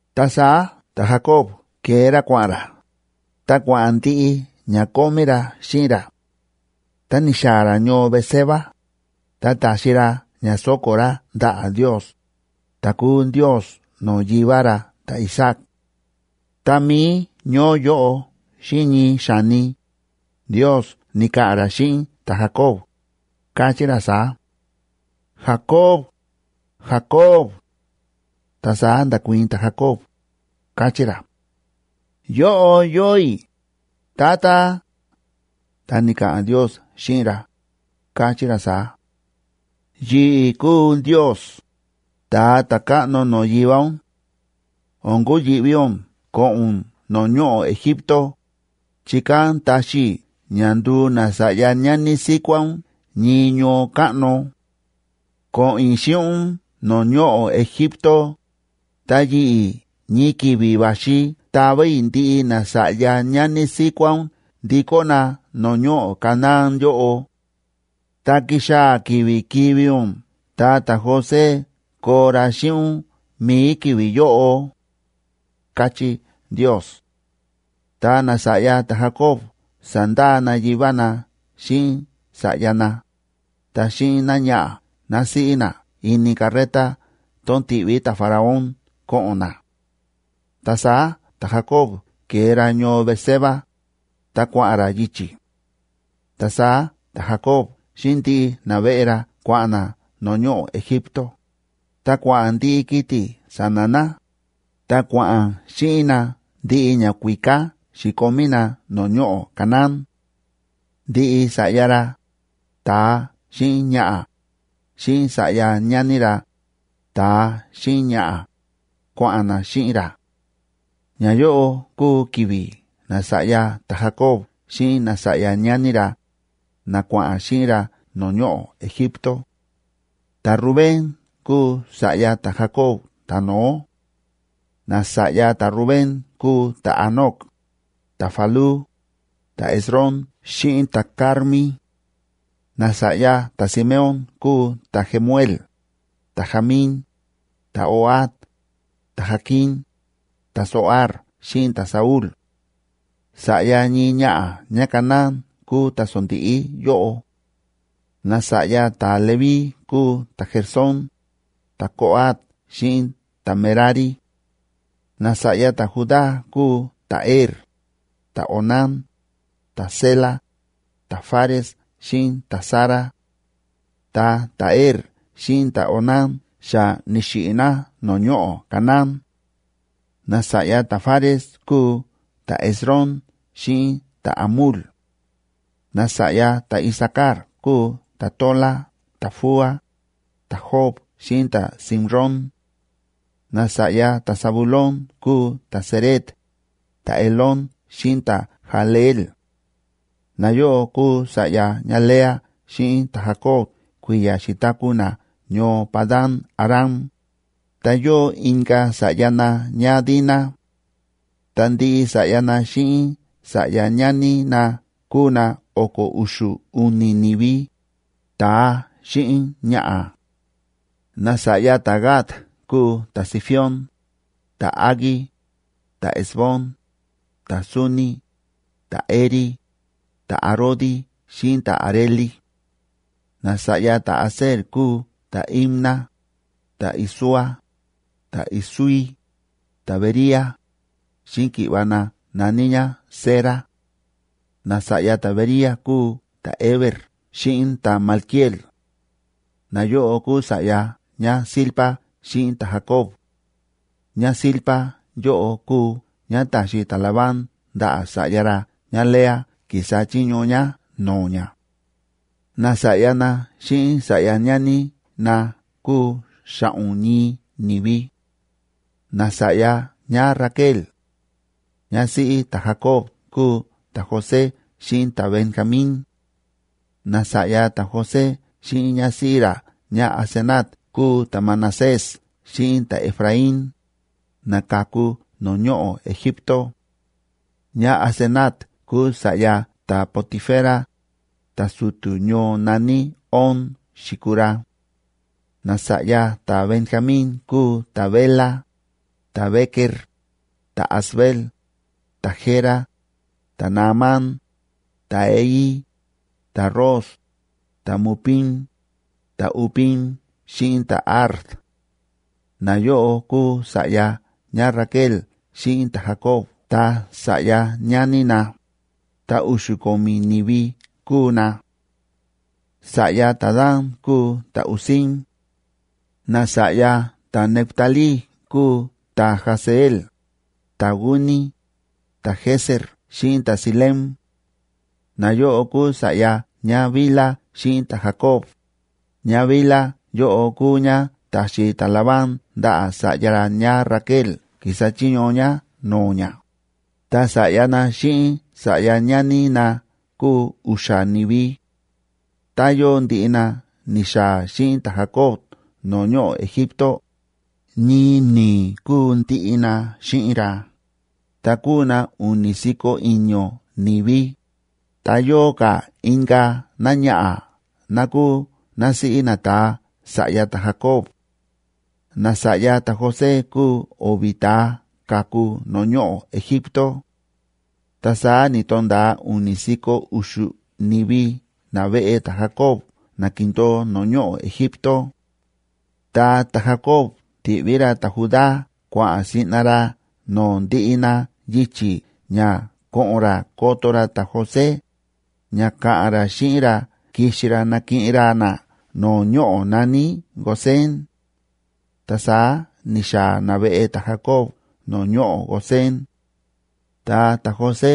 Ta saá ta̱Jacoba ke̱e ra kua̱ꞌa̱n ra, ta kua̱ꞌa̱n ndiꞌi ña kómí ra xíꞌin ra. Tá ni̱xaa̱ ra ñoo Beerseba, ta ta̱xi ra ña sóko̱ ra ndaꞌa̱ Ndios, ta̱ kúu Ndios no̱o̱ yivá ra ta̱Isaac. Tá mií ñoó yóꞌo xíꞌin ñii xa̱ni, Ndios ni̱ka̱ꞌa̱n ra xíꞌin ta̱Jacob, káchí ra saá: ―¡Jacob! ¡Jacob! Ta saá nda̱kuii̱n ta̱Jacob, káchí ra: ―Yóꞌo yóo i̱, Tata. Ta ni̱ka̱ꞌa̱n Ndios xíꞌin ra, káchí ra saá: ―Yi̱ꞌi̱ kúu Ndios, ta̱a ta̱káꞌno no̱o̱ yivá ún. O̱n kuyi̱ꞌví ún ko̱ꞌo̱n ún no̱o̱ ñoꞌo̱ Egipto, chi kán taxi i̱ ña nduu nasa̱ꞌya ñani síkuá ún ñii ñoo káꞌno. Ko̱ꞌo̱n i̱ xíꞌin ún no̱o̱ ñoꞌo̱ Egipto, ta yi̱ꞌi̱, ñii ki̱vi̱ va̱xi tava i̱ ndiꞌi nasa̱ꞌya ñani síkuá ún ndikó na no̱o̱ ñoꞌo̱ Canaán yóꞌo. Ta kixaa̱ ki̱vi̱ kivi̱ ún, ta ta̱José koo ra xíꞌin ún mi̱i ki̱vi̱ yóꞌo ―káchí Ndios. Ta nasa̱ꞌya ta̱Jacob sa̱ndaa na yivá na xíꞌin sa̱ꞌya na, ta xíꞌin náñaꞌa̱ násíꞌí na ini carreta tón ti̱ꞌví ta̱Faraón ko̱ꞌo̱n na. Ta saá ta̱Jacob ke̱e ra ñoo Beerseba, ta kua̱ꞌa̱n ra yichi̱. Ta saá ta̱Jacob xíꞌin ndiꞌi naveꞌe ra kua̱ꞌa̱n na no̱o̱ ñoꞌo̱ Egipto, ta kua̱ꞌa̱n ndiꞌi kiti̱ sa̱na̱ na, ta kua̱ꞌa̱n xíꞌin na ndiꞌi ñakuíká xi̱komí na no̱o̱ ñoꞌo̱ Canaán. Ndiꞌi sa̱ꞌya ra, ta̱a xíꞌin ñaꞌa̱, xíꞌin sa̱ꞌya ñani ra, ta̱a xíꞌin ñaꞌa̱, kua̱ꞌa̱n na xíꞌin ra. Ñayóꞌo kúu ki̱vi̱ nasa̱ꞌya ta̱Jacob xíꞌin nasa̱ꞌya ñani ra, na kua̱ꞌa̱n xíꞌin ra no̱o̱ ñoꞌo̱ Egipto. Ta̱Rubén kúu sa̱ꞌya ta̱Jacob ta̱no̱ó. Nasa̱ꞌya ta̱Rubén kúu ta̱Hanoc, ta̱Falú, ta̱Hezrón xíꞌin ta̱Carmi. Nasa̱ꞌya ta̱Simeón kúu ta̱Jemuel, ta̱Jamín, ta̱Ohad, ta̱Jaquín, ta̱Zohar xíꞌin ta̱Saúl; sa̱ꞌya ñii ñaꞌa̱ ñáCanaán kúu ta̱sondíꞌí yóꞌo. Nasa̱ꞌya ta̱Leví kúu ta̱Gersón, ta̱Coat xíꞌin ta̱Merari. Nasa̱ꞌya ta̱Judá kúu ta̱Er, ta̱Onán, ta̱Sela, ta̱Fares xíꞌin ta̱Zara. Ta ta̱Er xíꞌin ta̱Onán xa ni̱xiꞌi̱ na no̱o̱ ñoꞌo̱ Canaán. Nasa̱ꞌya ta̱Fares kúu ta̱Hezrón xíꞌin ta̱Hamul. Nasa̱ꞌya ta̱Isacar kúu ta̱Tola, ta̱Fúa, ta̱Job xíꞌin ta̱Simrón. Nasa̱ꞌya ta̱Zabulón kúu ta̱Sered, ta̱Elón xíꞌin ta̱Jahleel. Nayóꞌo kúu sa̱ꞌya ñáLea xíꞌin ta̱Jacob kui̱ya̱ xi̱taku̱ na ñoo Padan‑aram, ta yóo inka̱ sa̱ꞌya na ñáDina. Ta ndiꞌi sa̱ꞌya na xíꞌin sa̱ꞌya ñani na kúu na o̱ko̱ u̱xu̱ u̱ni̱ ni̱vi, ta̱a xíꞌin ñaꞌa̱. Nasa̱ꞌya ta̱Gad kúu ta̱Zifión, ta̱Hagui, ta̱Ezbón, ta̱Suni, ta̱Eri, ta̱Arodi xíꞌin ta̱Areli. Nasa̱ꞌya ta̱Aser kúu ta̱Imna, ta̱Isúa, ta̱Isúi, ta̱Bería, xíꞌin ki̱ꞌva̱ na na̱ní ñá Sera. Nasa̱ꞌya ta̱Bería kúu ta̱Heber xíꞌin ta̱Malquiel. Nayóꞌo kúu sa̱ꞌya ñáZilpa xíꞌin ta̱Jacob. ÑáZilpa yóꞌo kúu ñá ta̱xi ta̱Labán ndaꞌa̱ sa̱ꞌya ra ñáLea ki̱sa chiño ñá no̱o̱ ñá. Nasa̱ꞌya na xíꞌin sa̱ꞌya ñani na kúu xa̱ꞌo̱n ñii ni̱vi. Nasa̱ꞌya ñáRaquel, ñásíꞌí ta̱Jacob kúu ta̱José xíꞌin ta̱Benjamín. Nasa̱ꞌya ta̱José xíꞌin ñásíꞌí ra ñáAsenat kúu ta̱Manasés xíꞌin ta̱Efraín, na ka̱ku no̱o̱ ñoꞌo̱ Egipto. ÑáAsenat kúu sa̱ꞌya ta̱Potifera, ta̱su̱tu̱ ñoo na̱ní On xi̱kuu ra. Nasa̱ꞌya ta̱Benjamín kúu ta̱Bela, ta̱Bequer, ta̱Asbel, ta̱Gera, ta̱Naamán, ta̱Ehi, ta̱Ros, ta̱Mupim, ta̱Hupim xíꞌin ta̱Ard. Nayóꞌo kúu sa̱ꞌya ñáRaquel xíꞌin ta̱Jacob ta sa̱ꞌya ñani na, ta u̱xu̱ ko̱mi̱ ni̱vi kúu na. Sa̱ꞌya ta̱Dan kúu ta̱Husim. Nasa̱ꞌya ta̱Neftalí kúu ta̱Jahzeel, ta̱Guni, ta̱Jezer xíꞌin ta̱Silem. Nayóꞌo kúu sa̱ꞌya ñáBilha xíꞌin ta̱Jacob. ÑáBilha yóꞌo kúu ñá ta̱xi ta̱Labán ndaꞌa̱ sa̱ꞌya ra ñáRaquel ki̱sa chiño ñá no̱o̱ ñá, ta sa̱ꞌya na xíꞌin sa̱ꞌya ñani na kúu u̱xa̱ ni̱vi. Ta yóo ndiꞌi na ni̱xaa̱ xíꞌin ta̱Jacob no̱o̱ ñoꞌo̱ Egipto, ñii ni̱i̱ kúu ndiꞌi na xíꞌin ra, ta kúu na u̱ni̱ si̱ko̱ i̱ño̱ ni̱vi, ta yóo ka̱ inka̱ náñaꞌa̱ ná kúu násíꞌí nata̱a sa̱ꞌya ta̱Jacob. Nasa̱ꞌya ta̱José kúu o̱vi̱ ta̱a ka̱ku no̱o̱ ñoꞌo̱ Egipto. Ta saá ni̱to̱nda̱a u̱ni̱ si̱ko̱ u̱xu̱ ni̱vi naveꞌe ta̱Jacob na ki̱ndo̱o no̱o̱ ñoꞌo̱ Egipto. Ta ta̱Jacob ti̱ꞌví ra ta̱Judá kua̱ꞌa̱n siꞌna ra no̱o̱ ndiꞌi na yichi̱ ña ko̱ꞌo̱n ra koto ra ta̱José, ña ka̱ꞌa̱n ra xíꞌin ra kixi ra nakiꞌin ra na no̱o̱ ñoꞌo̱ na̱ní Gosén. Ta saá ni̱xaa̱ naveꞌe ta̱Jacob no̱o̱ ñoꞌo̱ Gosén. Ta ta̱José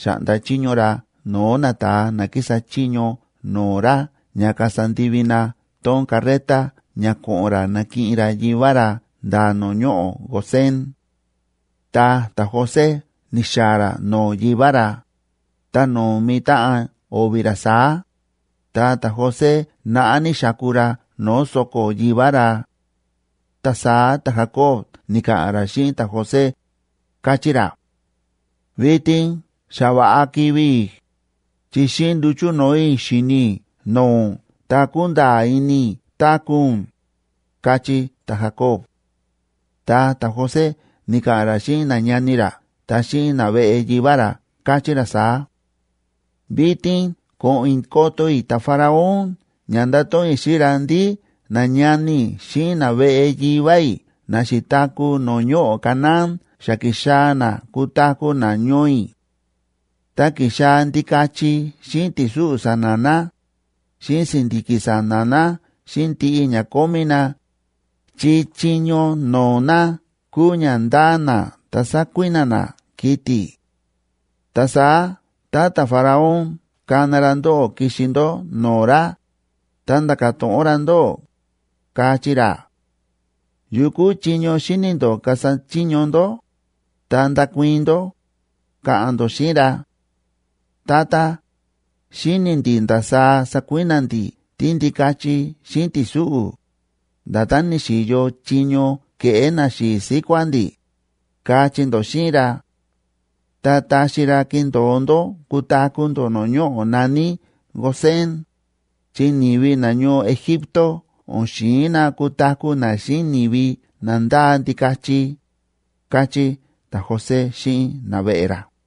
xa̱ꞌnda chiño ra no̱o̱ nata̱a na kísa chiño no̱o̱ ra ña kasa ndivi na tón carreta ña ko̱ꞌo̱n ra nakiꞌin ra yivá ra nda̱ no̱o̱ ñoꞌo̱ Gosén. Tá ta̱José ni̱xaa̱ ra no̱o̱ yivá ra, ta nómi táꞌan o̱vi̱ ra saá, ta ta̱José naꞌá ní xáku ra no̱o̱ so̱ko̱ yivá ra. Ta saá ta̱Jacob ni̱ka̱ꞌa̱n ra xíꞌin ta̱José, káchí ra: ―Vitin xa va̱ꞌa kivi̱ i̱, chi xíꞌin nduchu̱ no̱o̱ i̱ xíni i̱ no̱o̱ ún ta kúnda̱a̱ ini i̱ táku̱ ún ―káchí ta̱Jacob. Ta ta̱José ni̱ka̱ꞌa̱n ra xíꞌin nañani ra ta xíꞌin naveꞌe yivá ra, káchí ra saá: ―Vitin ko̱ꞌo̱n i̱ koto i̱ ta̱Faraón ña ndato̱ꞌon i̱ xíꞌin ra ndí nañani i̱ xíꞌin naveꞌe yivá i̱ na xi̱taku̱ no̱o̱ ñoꞌo̱ Canaán xa ki̱xaa̱ na kutaku̱ na ñoo i̱; ta ki̱xaa̱ ndikachi xíꞌin ti̱súꞌu̱ sa̱na̱ na, xíꞌin si̱ndi̱ki̱ sa̱na̱ na xíꞌin ndiꞌi ña kómí na, chi chiño no̱o̱ na kúu ña ndáa na ta sákui̱na̱ na kiti̱. Ta saá tá ta̱Faraón kana ra ndóꞌó kixi ndó no̱o̱ ra, ta nda̱ka̱ to̱ꞌon ra ndóꞌó, kachí ra: “Yukú chiño xíni̱ ndó kasa chiño ndó”, ta ndakuii̱n ndó, ka̱ꞌa̱n ndó xíꞌin ra: “Tata, xíni̱ ndi̱ ndasaá sakui̱na̱ ndi̱ tíndikachi xíꞌin ti̱súꞌu̱, nda̱tán ni̱xi̱yo chiño ke̱ꞌé naxi̱i̱ síkuá ndi̱”, kachí ndó xíꞌin ra. Ta taxi ra kindo̱o ndó kutaku̱ ndó no̱o̱ ñoꞌo̱ na̱ní Gosén, chi ni̱vi nañoo Egipto o̱n xi̱in na kutaku̱ na xíꞌin ni̱vi na ndáa ndikachi ―káchí ta̱José xíꞌin naveꞌe ra.